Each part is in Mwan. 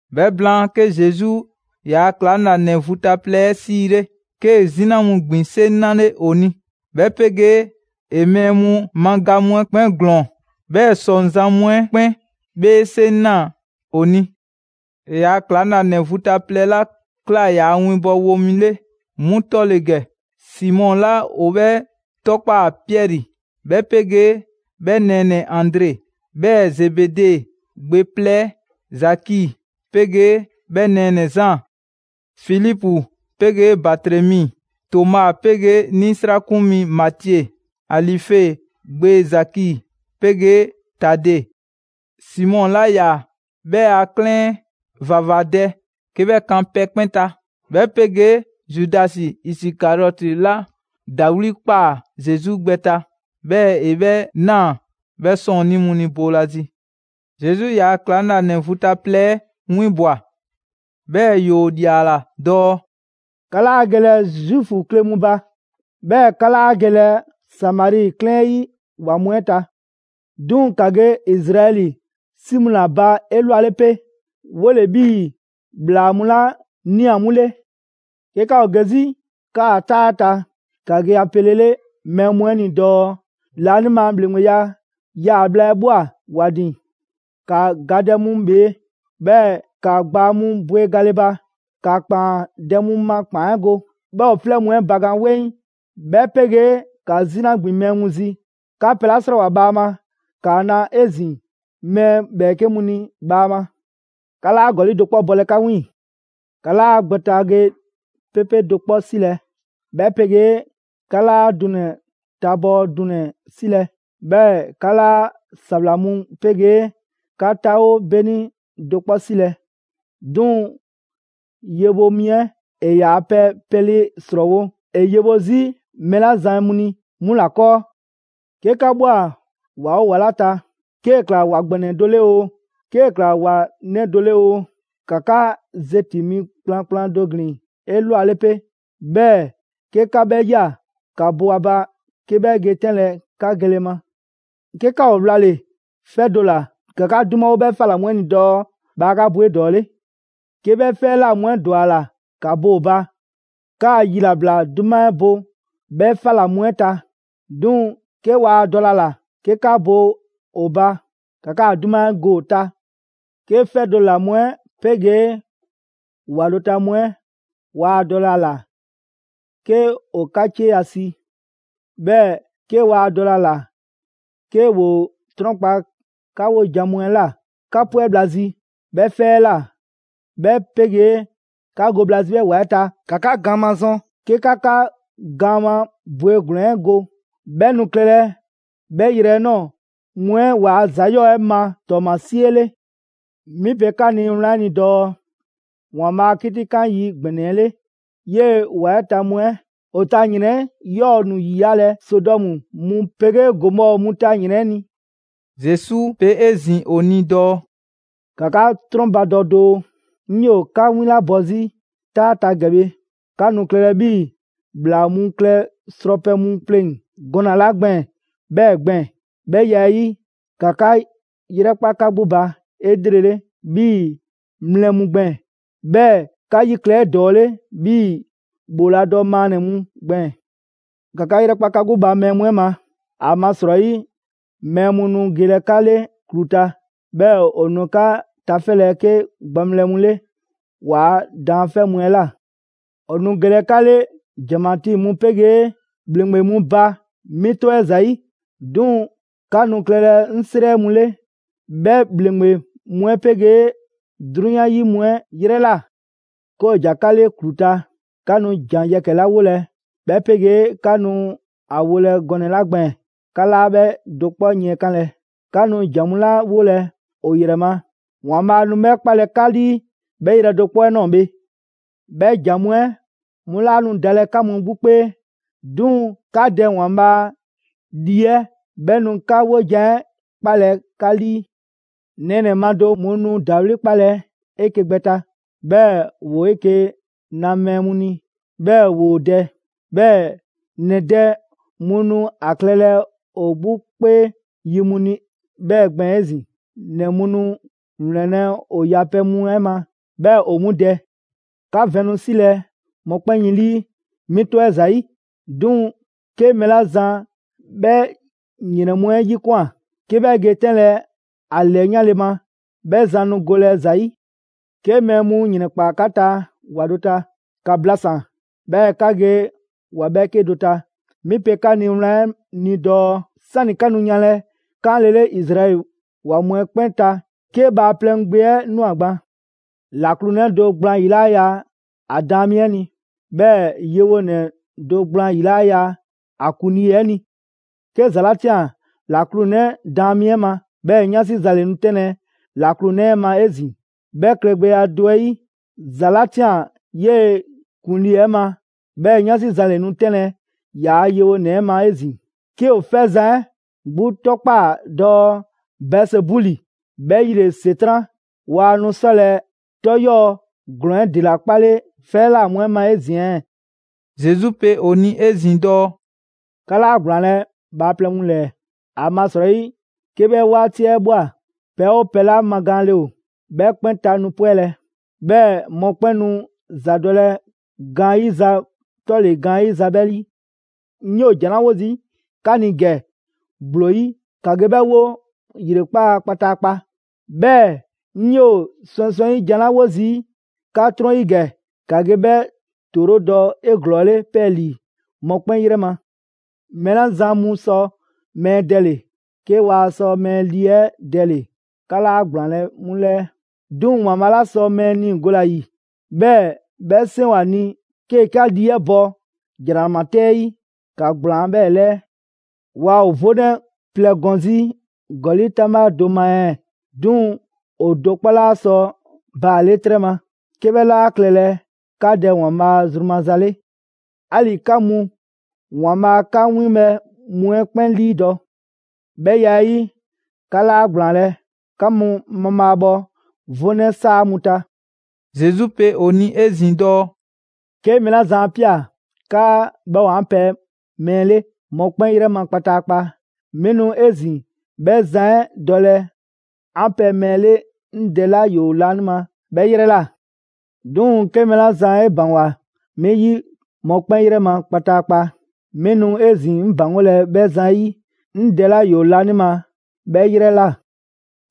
'Bhɛ blaan, 'ke Zesu ‑yaa' ‑klaŋlanɛ vu ta plɛ 'ɛ 'siile, 'kee‑ 'zina mu ‑gbin 'seŋ 'nale‑ ‑o ni, 'bhɛ 'pegee ‑e mɛɛ mu ma ga mu 'ɛ 'kpɛn ‑glɔɔn, 'bhɛɛ‑ ‑sɔŋzan' mu 'ɛ 'kpɛn 'bhee 'seŋ ꞊naa ‑o ni. ‑E ‑yaa' ‑klaŋlanɛ vu ta plɛ 'la ꞊kla ‑yaa ‑winbɔwo mu 'le, 'mu 'tɔ ‑le ‑gɛ: Simɔ 'la ‑o 'bhɛ 'tɔkpaa‑ Piɛri, 'bhɛ 'pegee 'bhɛ nɛɛnɛ‑ Andre; 'bhɛɛ‑ Zebede gbe plɛ 'ɛ Zaki 'pegee 'bhɛ nɛɛnɛ‑ Zaan; Filipu 'pegee Batremi; Toma 'pegee 'nisrakun mi Matie; Alife gbe Zaki 'pegee Tade; Simɔ 'la 'yaa‑ 'bhɛ a 'klɛɛn ‑vavadɛ 'ke 'bhɛ kan pɛ 'kpɛn ta, 'bhɛ 'pegee Zudasi Isikariɔti 'la ‑dawli' ꞊kpaa Zesu gbɛ ta, 'bhɛɛ‑ ‑e 'bhɛ ꞊naa 'bhɛ 'sɔɔnnii mu ni boolazi. Zesu ‑yaa' ‑klaŋlanɛ vu ta plɛ 'ɛ 'winbwa‑, 'bhɛɛ‑ ‑yoo ‑liala dɔɔ: «'Ka 'laa gelɛ Zuufu kle mu ba, 'bhɛɛ‑ 'ka 'laa gelɛ Samari 'klɛɛn 'yi ‑wa mu 'ɛ ta. 'Duŋ‑ ‑ka ge Izraɛli 'si mu ‑la ba 'elwale 'pe: 'Wole‑ 'bhii‑ ‑bhlaa mu 'la ꞊nia 'mu 'le. 'Ke 'ka ‑o ge 'zi 'kaa‑ 'taa 'ɛ ta, ‑ka ge ‑a pelele mɛɛ mu 'ɛ ni dɔɔ: ‹Laanima ‑Bhleŋgbeya 'yaa‑ bhla 'ɛ ꞊bhwa ‑wa ‑din.› ‑Ka gadɛ mu ‑bhee', 'bhɛɛ‑ ‑ka gbaa mu bwe gale ba; ‑ka ‑kpaandɛ' mu ma ‑kpaan 'ɛ go, 'bhɛɛ‑ ‑o 'flɛ mu 'ɛ bakan 'weŋ, 'bhɛ 'pegee ‑ka 'zina ‑gbin mɛɛ mu zi. 'Ka pɛ 'la 'srɔɔwoa‑ bhaama, ‑kaa na 'ezin‑ mɛɛ ‑bhɛɛke' mu ni bhaama. 'Ka 'laa ‑gɔli' do 'kpɔ bɔlɛ 'ka 'wiiŋ‑. 'Ka 'laa gbɛn ta ge 'pepe dɔ 'kpɔ 'silɛ‑, 'bhɛ 'pegee 'ka 'laa dunɛ‑ tabɔɔ dunɛ‑ 'silɛ‑; 'bhɛɛ‑ 'ka 'laa ‑sawla mu 'pegee 'ka 'taawo 'beni do 'kpɔ 'silɛ‑. 'Duŋ‑ yewo mi 'ɛ ‑e ‑yaa pɛ pɛle ‑srɔɔwo' ‑e yewo 'zi mɛɛ 'la zan mu ni 'mu ‑la 'kɔɔ.» «'Ke 'ka ꞊bhwa ‑wa 'oo ‑wa 'la ta: 'kee‑ ꞊kla ‑wa ‑gbɛnɛ do 'le oo, 'kee‑ ꞊kla ‑wa 'nɛ do 'le oo, ‑ka 'ka zeti‑ mi kplankplan do ‑glin 'elwale 'pe, 'bhɛɛ‑ 'ke 'ka 'bhɛ ꞊ya, ‑ka bo ‑a ba 'ke 'bhɛ ge 'tɛnlɛ‑ 'ka gele ma. 'Ke 'ka ‑o 'wlale‑ 'fɛ do ‑la, ‑ka 'ka 'dumawo 'bhɛ 'fa ꞊la mu 'ɛ ni dɔɔ: ‹Bhaa 'ka bo 'edɔɔle.› 'Ke 'bhɛ 'fɛ 'ɛ ꞊la mu 'ɛ ‑dwa ‑a ‑la 'ka bo ‑o ba, 'kaa‑ yilabla 'duma 'ɛ bo 'bhɛ 'fa mu 'ɛ ta; 'duŋ‑ 'ke waa dɔlɛ a ‑la 'ke 'ka bo ‑o ba, ‑ka 'kaa‑ 'duma 'ɛ go ‑o ta. 'Ke 'fɛ do ‑la mu 'ɛ 'pegee ‑wa do ta mu 'ɛ, waa dɔlɛ ‑a ‑la 'ke ‑o 'ka 'cieya‑ si, 'bhɛɛ‑ 'ke waa dɔlɛ ‑a ‑la 'ke ‑woo 'trɔnkpa‑ 'ka 'wojan‑ mu 'ɛ ꞊la, 'ka 'pwɛ bhla zi 'bhɛ 'fɛ 'ɛ ꞊la, 'bhɛ 'pegee 'ka go bhla zi 'bhɛ ‑wa 'ɛ ta, ‑ka 'ka gaan mazɔn 'ke 'ka 'ka gaan ma bwegblɛn‑ 'ɛ go; 'bhɛ nu klɛlɛ 'bhɛ yrɛ 'ɛ ꞊nɔɔ mu 'ɛ ‑waa' ‑za 'yɔɔ‑ 'ɛ ma ‑tɔɔmasie 'le. 'Mi pe 'ka ni wlan 'ɛ ni dɔɔ: ‑Waanbhaa' a 'kitikan yi ‑gbɛnɛ 'ɛ 'le, 'yee‑ ‑wa 'ɛ ta mu 'ɛ, ‑o ta ‑yrɛn 'ɛ 'yɔɔ‑ nu ‑yiyalɛ Sodɔmu mu 'pegee Gomɔɔ mu ta ‑yrɛn 'ɛ ni.» Zesu pe 'ezin‑ ‑o ni dɔɔ: «‑Ka 'ka 'trɔnbadɔ doo! 'Ŋ 'yoo‑ 'ka 'winlabɔ 'zi 'taa ta ‑gɛ bhe, 'ka nu klɛlɛ 'bhii‑ ‑bhlaa mu klɛ srɔpɛ mu pleŋ‑ gɔnɛ‑ 'la gbɛɛn‑ 'bhɛɛ‑ ‑gbɛɛn. 'Bhɛ ya 'ɛ 'yi, ‑ka 'ka 'yrɛkpa 'ka 'gbu ba 'elrele 'bhii‑ mlɛ mu gbɛɛn‑, 'bhɛɛ‑ 'ka 'yi klɛ 'edɔɔle 'bhii‑ ‑bhooladɔ maannɛ‑ mu gbɛɛn‑. ‑Ka 'ka 'yrɛkpa 'ka 'gbu ba mɛɛ mu 'ɛ ma, ‑amasrɔyi mɛɛ mu nu gelɛ 'ka 'le ‑klu ta, 'bhɛɛ‑ ‑o nu 'ka tafɛlɛ 'ke gbaŋbhlɛ mu 'le ‑waa' daanfɛ' mu 'ɛ ꞊la. ‑O nu gelɛ 'ka 'le ‑janmatii mu 'pegee ‑bhleŋgbe mu ba 'mi 'tɔ 'ɛ ‑zayi', 'duŋ‑ 'ka nu klɛlɛ 'ŋ 'srɛ mu 'le 'bhɛ ‑bhleŋgbe mu 'ɛ 'pegee 'drunyan 'yi mu 'ɛ 'yrɛ ꞊la. 'Ke ‑o ‑ja 'ka 'le ‑klu ta, 'ka nu ‑jan yɛkɛ‑ 'la 'wolɛ‑, 'bhɛ 'pegee 'ka nu ‑a wolɛ gɔnɛ‑ 'la gbɛɛn‑, 'ka 'laa 'bhɛ do 'kpɔ yiɛnkanlɛ. 'Ka nu ‑jan mu 'la 'wolɛ‑ ‑o ‑yrɛ ma, ‑Waanbhaa' nu 'bhɛ 'kpalɛ‑ 'ka 'lii 'bhɛ yrɛ do 'kpɔ 'ɛ ꞊nɔɔ bhe. 'Bhɛ ‑jan mu 'ɛ 'mu 'laa nu dalɛ 'ka mu 'gbu 'kpee, 'duŋ‑ 'ka Dɛ ‑Waanbhaa' Lii 'ɛ 'bhɛ nu 'ka 'wojan‑ 'ɛ 'kpalɛ‑ 'ka 'lii.» Nɛɛnɛ‑ ma do mu nu ‑dawli' 'kpalɛ‑ 'eke‑ gbɛ ta, 'bhɛɛ‑ ‑woo 'eke‑ na mɛɛ mu ni 'bhɛɛ‑ ‑woo dɛ. 'Bhɛɛ‑ ‑nɛ dɛ mu nu ‑a klɛlɛ ‑o 'gbu 'kpee yi mu ni 'bhɛɛ‑ gbɛɛn‑ 'ezin‑. ‑Nɛ mu nu ‑wlɛnlɛ' ‑o yapɛ mu 'ɛ ma 'bhɛɛ‑ ‑o 'mu dɛ. 'Ka vɛn nu 'silɛ‑ mɔkpɛn' yin ‑lii 'mi 'tɔ 'ɛ ‑zayi'; 'duŋ‑ 'ke mɛɛ 'la zan 'bhɛ ‑yrɛn mu 'ɛ 'yikwan꞊ 'ke 'bhɛ ge 'tɛnlɛ‑ ‑a ‑lɛyanle ma, 'bhɛ zan nu golɛ ‑za 'yi. 'Ke mɛɛ mu ‑yrɛnkpaa 'ka ta ‑wa do ta, ‑ka blasan‑, 'bhɛɛ‑ ‑ka ge ‑wa 'bhɛɛke do ta. 'Mi pe 'ka ni wlan 'ɛ ni dɔɔ: 'Sani 'ka nu yanlɛ 'kaanlele Izraɛli ‑wa mu 'ɛ 'kpɛn ta, 'ke Bhaaplɛŋ Gbe 'ɛ ꞊nwa gban. «‑Laklu 'nɛ do gblaan 'yi 'laa ya ‑a daan mi 'ɛ ni, 'bhɛɛ‑ yewonɛ do gblaan ‑yi 'laa ya ‑a ‑kuŋlii 'ɛ ni. 'Ke ‑za 'la ꞊tian ‑laklunɛ daan mi 'ɛ ma, 'bhɛɛ‑ 'yansi za ‑le nu 'tɛnlɛ‑ ‑laklunɛ 'ɛ ma 'ezin‑. 'Bhɛ klɛgbɛya do 'ɛ 'yi, ‑za 'la ꞊tian 'yee‑ ‑kuŋlii 'ɛ ma, 'bhɛɛ‑ 'yansi za ‑le nu 'tɛnlɛ‑ ‑yaa' yewonɛ 'ɛ ma 'ezin‑. 'Ke ‑o 'fɛzan‑ 'ɛ 'gbu 'tɔkpaa‑ dɔɔ Bɛɛzebuli ('bhɛ 'yi ‑le ‑Setran'), waa nu 'sɔlɛ‑ 'tɔ 'yɔɔ‑ ‑glɔɔn 'ɛ ‑dela 'kpale 'fɛ 'ɛ ꞊la mu 'ɛ ma 'ezin‑ ɛɛ?» Zesu pe ‑o ni 'ezin‑ dɔɔ: «'Ka 'laa ‑gblaanlɛ' bhaaplɛŋ mu ‑lɛɛ. ‑Amasrɔyi 'ke 'bhɛ 'waati 'ɛ ꞊bhwa, pɛ 'oo pɛ 'la magaanle ‑o, 'bhɛ 'kpɛn ta nu 'pwɛlɛ‑, 'bhɛɛ‑ mɔkpɛn' nu ‑zadɔlɛ gaanyiza 'tɔle‑ gaanyiza 'bhɛ 'yi. 'Ŋ 'yoo‑ ‑jan 'la 'wo zii' 'ka ni ‑gɛ ‑gblo 'yi, ‑ka ge 'bhɛ 'wo ‑yrekpaa' kpataakpa; 'bhɛɛ‑ 'ŋ 'yoo‑ swɛŋswɛŋ 'yi ‑jan 'la 'wo zii' 'ka 'trɔn 'yi ‑gɛ, ‑ka ge 'bhɛ ‑toorodɔ 'eglɔɔle 'pɛɛlii‑ mɔkpɛn' 'yrɛ ma. Mɛɛ 'la zan mu sɔ mɛɛ dɛle‑, 'ke waa sɔ mɛɛ lii 'ɛ dɛle‑, 'ka 'laa ‑gblaanlɛ' 'mu 'lɛɛ. 'Duŋ‑ ‑Waanbhaa' 'la sɔ mɛɛ niigole ‑a ‑yi, 'bhɛɛ‑ 'bhɛ 'seŋ ‑o ‑a ni 'kee‑ 'ka lii 'ɛ bɔ ‑jranama 'tɛ 'ɛ 'yi, ‑ka ‑gblaan' 'bhɛɛ‑ 'lɛɛ‑. Waa ‑o 'vonɛ plɛ gɔn zi ‑gɔli' 'taŋbha do ma ɛɛ? 'Duŋ‑ ‑o do 'kpɔ 'laa sɔ ‑baale' 'trɛ ma, 'ke 'bhɛ 'laa klɛlɛ 'ka Dɛ ‑Waanbhaa' zru maza 'le. 'Ali‑ 'ka mu, ‑Waanbhaa' 'ka 'winbhɛ‑ mu 'ɛ 'kpɛn 'liidɔ‑. 'Bhɛ ya 'ɛ 'yi, 'ka 'laa ‑gblaanlɛ'. 'Ka mu mabhaabhɔ 'vonɛ 'saa mu ta.» Zesu pe ‑o ni 'ezin‑ dɔɔ: «'Ke mɛɛ 'la zan 'a ꞊pia 'kaa 'bhɛ ‑o 'an pɛ mɛɛ 'le mɔkpɛn' 'yrɛ ma kpataakpa, 'mi nu 'ezin‑ 'bhɛ zan 'ɛ dɔlɛ 'an pɛ mɛɛ 'le 'ŋ Dɛ 'la ‑yoo laanima 'bhɛ 'yrɛ ꞊la. 'Duŋ‑ 'ke mɛɛ 'la zan 'e ‑baŋgwa 'mi 'yi mɔkpɛn' 'yrɛ ma kpataakpa, 'mi nu 'ezin‑ 'ŋ ‑baŋgolɛ 'bhɛ zan 'ɛ 'yi 'ŋ Dɛ 'la ‑yoo laanima 'bhɛ ‑yrɛ ꞊la.»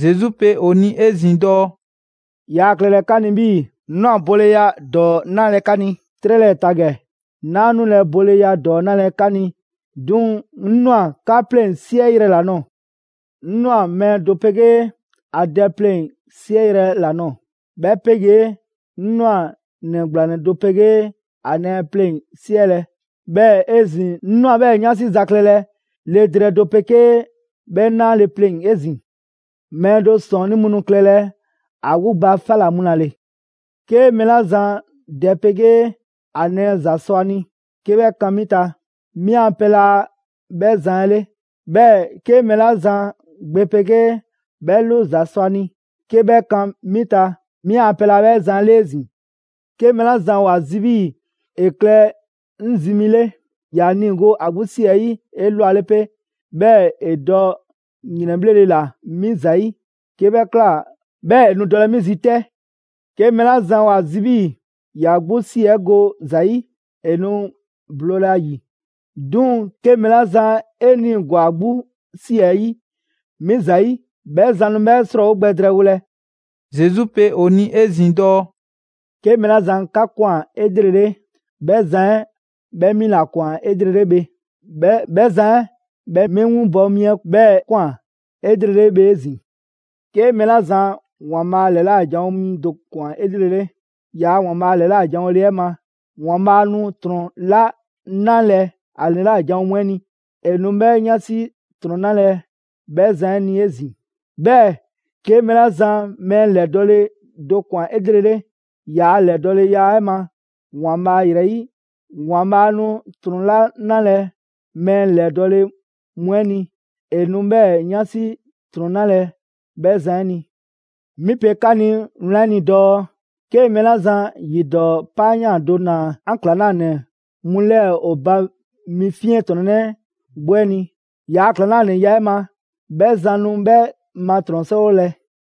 Zesu pe ‑o ni 'ezin‑ dɔɔ: «Yaa klɛlɛ 'ka ni 'bhii‑ 'ŋ ꞊nwa boleya ‑dɔɔ 'nalɛ‑ 'ka ni 'trɛ 'lɛɛ‑ ta ‑gɛ. 'Naa 'nulɛ‑ boleya ‑dɔɔ 'nulɛ‑ 'ka ni, 'duŋ‑ 'ŋ ꞊nwa 'ka 'pleŋ‑ 'siɛyrɛ‑ ‑la nɔɔ‑. 'Ŋ ꞊nwa mɛɛ do 'pegee ‑a dɛ pleŋ‑ 'siɛyrɛ‑ ‑la nɔɔ‑, 'bhɛ 'pegee 'ŋ ꞊nwa ‑nɛ ‑gblanɛ do 'pegee ‑a nɛɛ pleŋ‑ 'siɛlɛ‑; 'bhɛɛ‑ 'ezin‑ 'ŋ ꞊nwa 'bhɛɛ‑ 'yansi za klɛlɛ le drɛɛ do 'pegee 'bhɛ 'naale‑ pleŋ‑ 'ezin‑. Mɛɛ do 'sɔɔnnii mu nu klɛlɛ ‑a 'gbu ba 'fa ‑la mu ‑la ‑le.» «'Ke mɛɛ 'la zan dɛ 'pegee ‑a nɛɛ ‑za sɔ a ni 'ke 'bhɛ kan 'mi ta, 'mi a pɛ laa 'bhɛ zan 'ɛ 'le. 'Bhɛɛ‑ 'ke mɛɛ 'la zan gbe 'pegee 'bhɛ 'lu ‑za sɔ a ni 'ke 'bhɛ kan 'mi ta, 'mi a pɛ laa 'bhɛ zan 'ɛ 'le 'ezin‑. 'Ke mɛɛ 'la zan ‑o ‑a zi 'bhii‑ ‑e klɛ 'ŋ zi mi 'le, ‑ya niigo ‑a 'gbu 'si 'ɛ 'yi 'elwale 'pe, 'bhɛɛ‑ ‑e dɔ ‑yrɛnbhlele ꞊la 'mi ‑zayi', 'ke 'bhɛ ꞊kla, 'bhɛɛ‑ ‑e nu dɔlɛ 'mi zi 'tɛ. 'Ke mɛɛ 'la zan ‑o ‑a zi 'bhii‑ ‑ya 'gbu ‑si 'ɛ go ‑za 'yi, ‑e nu bloolɛ ‑a ‑yi; 'duŋ‑ 'ke mɛɛ 'la zan 'e 'niigwa‑ ‑a 'gbu ꞊si 'ɛ 'yi 'mi ‑zayi', 'bhɛ zan nu 'bhɛ 'srɔɔwo gbɛ drɛɛwolɛ.» Zesu pe ‑o ni 'ezin‑ dɔɔ: «'Ke mɛɛ 'la zan 'ka ꞊kwan 'elrele, 'bhɛ zan 'ɛ, 'bhɛ 'mi ‑la ꞊kwan 'elrele bhe; 'bhɛɛ‑ 'bhɛ zan 'ɛ 'bhɛ 'mi 'winbɔ mi 'ɛ 'bhɛɛ‑ ꞊kwan 'elrele bhe 'ezin‑. 'Ke mɛɛ 'la zan ‑Waanbhaa' ‑lɛla' janwo mi do ꞊kwan 'elrele ‑yaa' ‑Waanbhaa' ‑lɛla' janwoleya 'ɛ ma, ‑Waanbhaa' nu ‑trɔn 'la 'nalɛ‑ ‑a ‑lɛla' janwo mu 'ɛ ni, ‑e nu 'bhɛɛ‑ 'yansi ‑trɔn 'nalɛ‑ 'bhɛ zan 'ɛ ni 'ezin‑. 'Bhɛɛ‑ 'ke mɛɛ 'la zan mɛɛ ‑lɛdɔɔle do ꞊kwan 'elrele ‑yaa' ‑lɛdɔɔleya 'ɛ ma ‑Waanbhaa' ‑yrɛ 'yi, ‑Waanbhaa' nu ‑trɔn 'la 'nalɛ‑ mɛɛ ‑lɛdɔɔle mu 'ɛ ni, ‑e nu 'bhɛɛ‑ 'yansi ‑trɔn 'nalɛ‑ 'bhɛ zan 'ɛ ni. 'Mi pe 'ka ni wlan 'ɛ ni dɔɔ: 'Ke mɛɛ 'la zan ‑yi ‑dɔɔ 'paayan꞊ do ‑naa 'an ‑klaŋlanɛ mu 'lɛɛ‑ ‑o ba mi 'fiɛntrɔnnɛ 'gbu 'ɛ ni, ‑yaa' ‑klaŋlanɛya 'ɛ ma, 'bhɛ zan nu 'bhɛ ma ‑trɔn 'srɔɔwolɛ.»